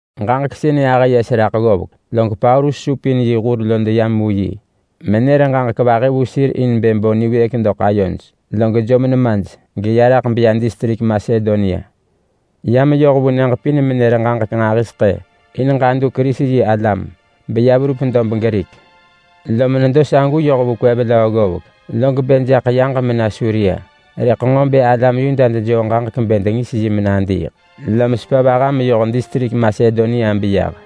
Ġaġek sënë ahë yes raḳ ggovek, log Paulus supin Yesu yi hur lo deyam vu yi, menër ġaġek vahi vu sir in bë bo niwëëk doḳ ayoj. Log jom nemaj geya raḳ beya distrik Masedonia. Ya meyoh vu nyëġ pin menër ġaġek nġahiseḳë in ġadu Kerisi-yi-alam beya verup dob Grik, lom nedo sagu yoh vu kwev löö ggovek, log bë jaḳ yaġ mena Suria. Rëḳ nġo bë alam Yuda dejoo ġaġek bë dengis yi menadiiḳ, lom sepa vaha meyoh distrik Masedonia beyah.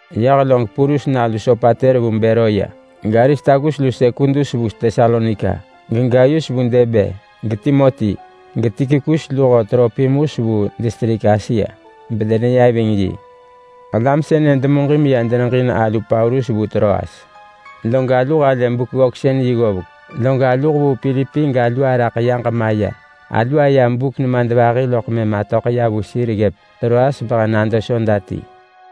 Yah log Purus nalu Sopater vu Beroya, gAristarkus lu MonSekudus vu Tesalonika, geGayus vu Derbe, geTimoti, geTukikus luho Tropimus vu distrik Asia, bedeneya ving yi. Alam sënë demuġin meya deneġin alu Paulus vu Troas. Log alu halë Buk-ggöksën-yi ggovek log alu hevuu Pilipi galu araḳ yaġ maya. Alu aya buk nemadvahi loḳ mëm atöḳ ya vu sir ggëp Troas behe nado soda ti.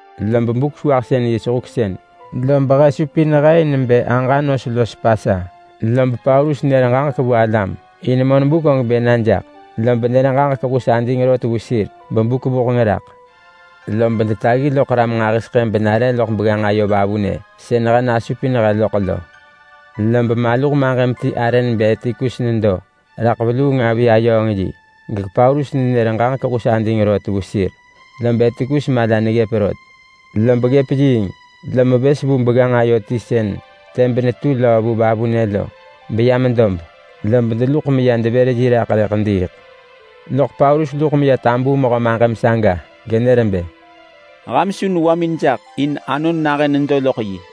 Lob Buk-sewahsën-yi sehuksën, lob he supin he in bë aġa nos los Pasa. Lob Paulus nër ġaġek vu alam, in monbuk og bë na jaḳ. Lob nër ġaġek hus ading rot vu sir bebuk vuheng raḳ. Lob detaggi loḳ ram nġahiseḳë benare loḳ begganġ ayo vavunë sën he nasupin he loḳ lo. Lob maluh maġëm ti arë nebë Etikus nedo raḳ veluung avi ayööng yi, gePaulus nenër ġaġek hus ading rot vu sir. Lob Etikus mala neggëp rot, lob ggëp yiing lom vës vu begganġ ayo ti sën tëb netu löö vu vavunë lo, beyam dob. Lob deluḳ meya devër yi raḳ rëḳ diiḳ. Loḳ Paulus luḳ meya tabuu mehö maġëm saga genër bë, “Ham su newamin jaḳ, in anon nahën nedo loḳ yi.”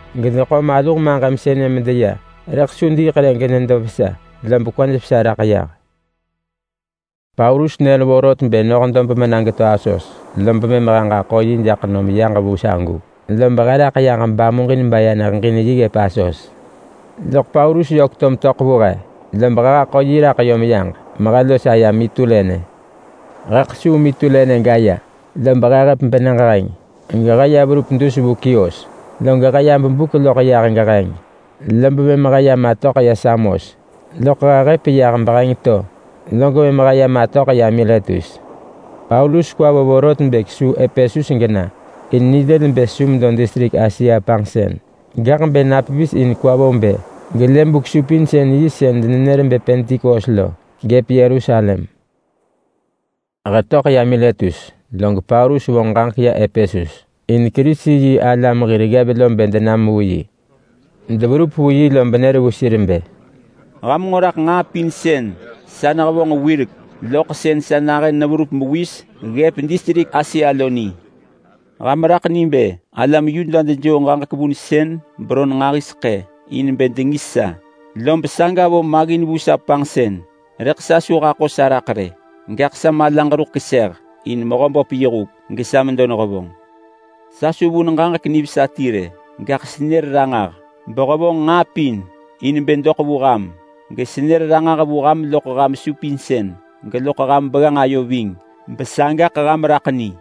Gedeḳo maluh maġëm sënë medeya. Rëḳ su diiḳ rë genedo vesa, lob kwaj vesa raḳ yah. Paulus nër muġin bë noh dob mena geto Asos, lob mëm he ġaḳo yi jaḳ nom yaġ vu sagu. Lob he raḳ yaġ bamuġin baya neheġin yi ggëp Asos. Loḳ Paulus yök to metöḳ vu he, lob he haḳo yi raḳ yom yaġ mehe los aya Mitulene. He kesuu Mitulene gaya, lob he hëp benyëġ heng, gehe ya verup dus vu Kios. Log he ya bebuk loḳ yah geheng, lob mëm he ya matöḳ ya Samos. Loḳ he hëp yah beheng to, log mëm he ya matöḳ ya Miletus. Paulus kwa vo vorot bë kesuu Epesus gena in nilël bë su medo distrik Asia panġsën. Gaḳ bë pevis in kwa vo bë gelë Buk-supinsën-yi sën denenër bë Pentikos lo, gëp Yerusalem. He töḳ ya Miletus, log Paulus vonġ ġaġek ya Epesus in Kerisi-yi-alam hir ggev lo bë denam vu yi. Deverup vu yi lob nër vu sir bë, “Ham nġo raḳ nġaa pin sën sa nehevonġ wirek loḳ sën sa nahën neverup mewis ggëp distrik Asia lo ni. Ham raḳ ni bë alam Yuda dejoo ġaġek vunsën beron nġahiseḳë in bë dengis sa, lob saga vo maggin vu sa panġsën. Rëḳ sa su haḳo sa raḳ rë, gaḳ sa malaġ ruḳ keseh in Mehöböp yi huk gesa medo nehevonġ. Sa su vun ġaġek nivesa ti rë, gaḳ senër ranġah behevonġ nġaa pin in bë doḳ vu ham. Gesenër ranġah vu ham loḳ ham supinsën, geloḳ ham begganġ ayo ving. Besagaḳ ham raḳ ni.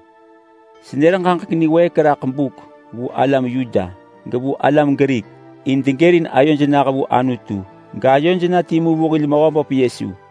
Senër ġaġek niwëëk raḳ buk vu alam Yuda, gevu alam Grik in degërin ayoj nah vu Anutu, gayoj na timu vu hil Mehöböp Yesu.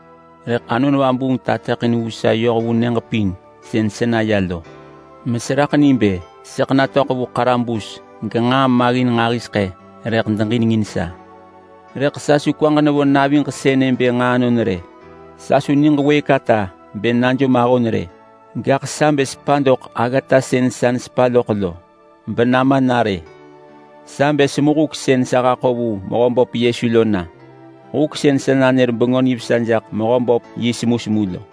Rëḳ Anon Vabuung tateḳin vu sa yoh vu nyëġ pin sën seya lo meseraḳ ni bë sëḳ natöḳ vu ḳarabus genġaa maggin nġahiseḳë rëḳ deġinengin sa. Rëḳ sa su kwaġ nevo naviġ sënë bë nġaa anon rë. Sa su niġ wëëk ata bë najom ahon rë, gaḳ sa bë sepa doḳ aggata sën sa nesepa loḳ lo, benama na rë. Sa bë semu huk sën sa haḳo vu Mehöböp Yesu lo na. Huk sën sa nanër Bengö Nivesa jaḳ Mehöböp yi semusemu lo.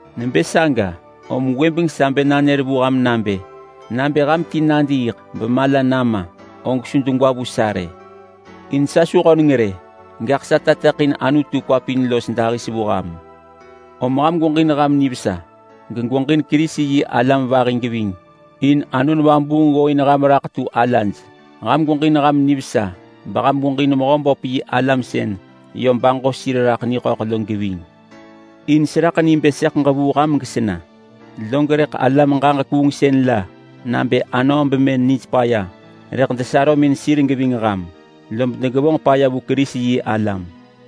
Nebë saga, om gwëbeng sa bë nanër vu ham nabë: Nabë ham ti nadiiḳ bemala nama, og su degwa vu sa rë, in sa su höneng rë, gaḳ sa tateḳin Anutu kwa pin los dahis vu ham. Om ham gweġin ham nivesa, gegweġin Kerisi-yi-alam vahi geving, in Anon Vabuung ggooin ham raḳ tu alaj. Ham gweġin ham nivesa beham gweġin Mehöböp yi alam sën yö baġo sir raḳ niḳöḳ lo geving. In seraḳ ni bë sëḳ ġevuu ham gesena, log rëḳ alam ġaġek kuungsën la nabë anöö bemën nij paya rëḳ desarömin sir geving ham, lob degevonġ paya vu Kerisi-yi-alam.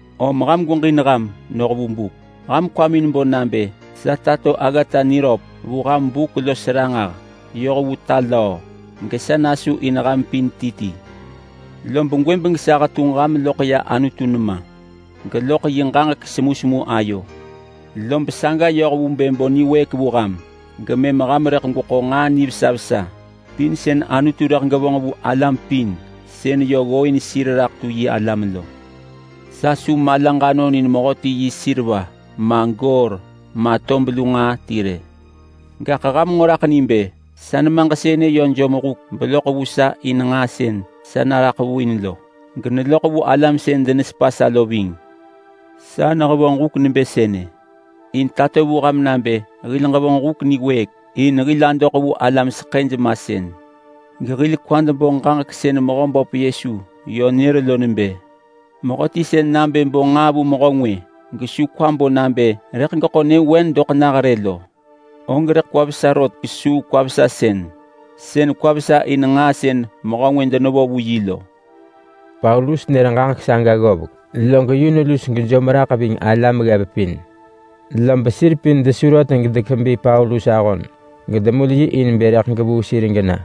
Om ham gweġin ham noh vu buk. Ham kwamin bo nabë sa tato aggata niröp vu ham buk los ranġah yoh vu ta löö. Gesa nasu in ham pin ti ti. Lob gwëbeng sa hetunġ ham loḳ ya Anutu nema, geloḳ yi ġaġek semusemu ayo, lob saga yoh vu bë bo niwëëk vu ham gemëm ham rëḳ gweḳo nġaa nivesa vesa pin sën Anutu rëḳ gevonġ vu alam pin sën yö ggooin sir raḳ tu yi alam lo. Sa su malaġ anon in mehöti yi seriva ma goor ma tob lu nġaa ti rë. Gaḳ ham nġo raḳ ni bë sa nemaġ sënë yö jom huk beloḳ vu sa in nġaa sën sa naraḳ vu in lo. Geneloḳ vu alam sën denesepa sa lo ving. Sa nehevonġ huk nebë sënë in tato vu ham nabë hil ġevonġ huk niwëëk in hil adoḳ vu alam seḳëj masën. Gehil kwad bo ġaġek sën Mehöböp Yesu yö nër lo nebë, ‘Mehöti sën nabë bo nġaa vu mehö ngwë, gesu kwa bo nabë rëḳ geḳo nyëvewen doḳ nah rë lo, og kwa vesa rot kesuu kwa-vesasën sën kwa vesa in nġaa sën mehö ngwë denevo vu yi lo.’” Paulus nër ġaġek saga ggovek, log yun lus gejom raḳ ving alam ggev pin. Lob sir pin desu rot gedekebi Paulus ahon gedemul yi in bë rëḳ gevuu sir gena.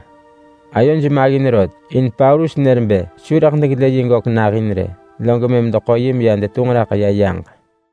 Ayoj maggin rot in Paulus nër bë su rëḳ degelë yi gök nahin rë. Log mëm deḳo yi meya detunġ raḳ ya yaġ.